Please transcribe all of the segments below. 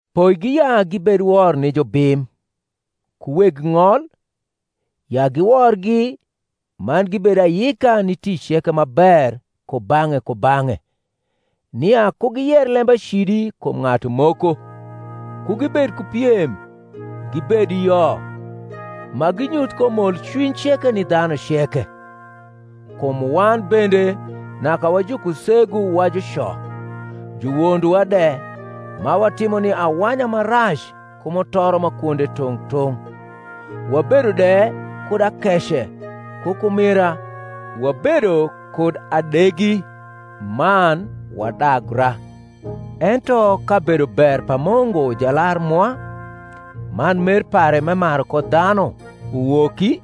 Poigi ya gibed wor ni jubim, ku weg ng’ol, ya giworgi, man gibed ayika ni tic ceke ma ber kubang’e kubang’e, nia ku giyer lembacidi kum ng’atu moko, ku gibed ku piem, gibed yo, ma ginyuth ko molcwiny ceke ni dhanu ceke. Kum wan bende naka wa jukusegu, wa juco, juwondowa de, ma watimo ni awanya ma rac ku mutoro ma kwonde tung’ tung’, wabedo de kud akece ku kumira, wabedo kud adegi, man wadagra. Ento ka bedober pa Mungu Jalar mwa, man mer pare m’emaru ko dhanu, uwoki,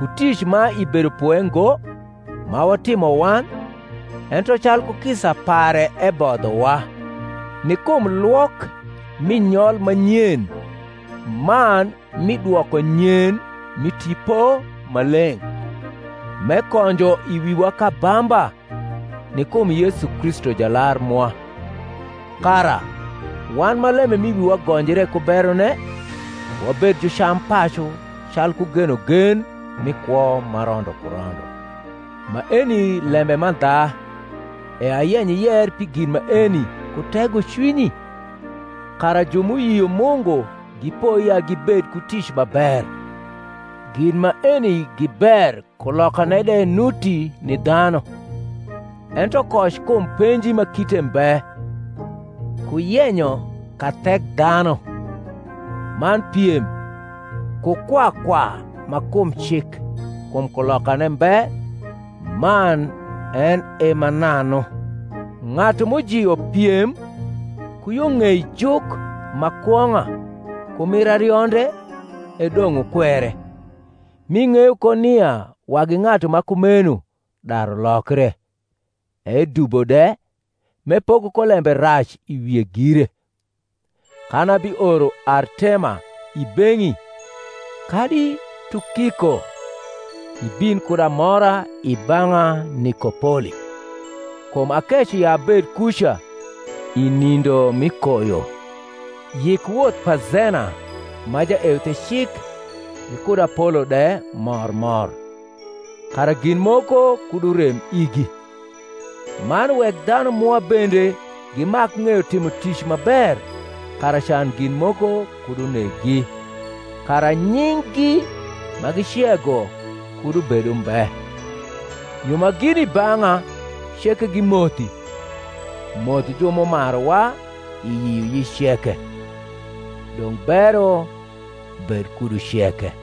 ku tic ma i bedopwe ngo, ma watimo wan, ento calku kisa pare ebodhowa, ni kum lwok mi nyol ma nyen man mi dwokonyen mi Tipo Maleng’, m’ekonjo i wiwa k’abamba, ni kum Yesu Kristu Jalar mwa; kara, wan ma lembe m’i wiwa gonjre ku berone, wabed jucampacu calku genogen mi kwo ma rondo ku rondo. Maeni lembe mandha, e ayenyo iyer pi gin maeni ku tegocwinyi, kara ju m’uyio Mungu gipoi ya gibed ku tic ma ber. Gin maeni gi ber kulokane de nuti ni dhanu: ento koc kum penji ma kite mbe, ku yenyo kathekdhanu, man piem, ku kwa kwa ma kum cik; kum kulokane mbe man en e mananu. Ng’atu m’ujio piem ku yo ng’ei juk ma kwong’a ku mir arionde e dong’ wukwere; m’ing’eyo ko nia wagi ng’atu ma kumeno daru lokre, edubo de, m’epoko ko lembe rac i wie gire. Kan abioro Artema i beng’i, kadi Tukiko, ibin kud amora i bang’a Nikopoli: kum akeco ya abed kuca i nindo mi koyo. Yik woth pa Zena ma jaeuthecik gikud Apolo de mor mor, kara gin moko kud urem igi. Man wek dhanu mwa bende gimak ng’eyo timo tic ma ber kara can gin moko kud uneggi, kara nying’gi ma gicego kud ubed umbe. Ju ma gini i bang’a ceke gimothi. Moth ju m’umaruwa i yioyic ceke. Dong’ bero bed kudu ceke.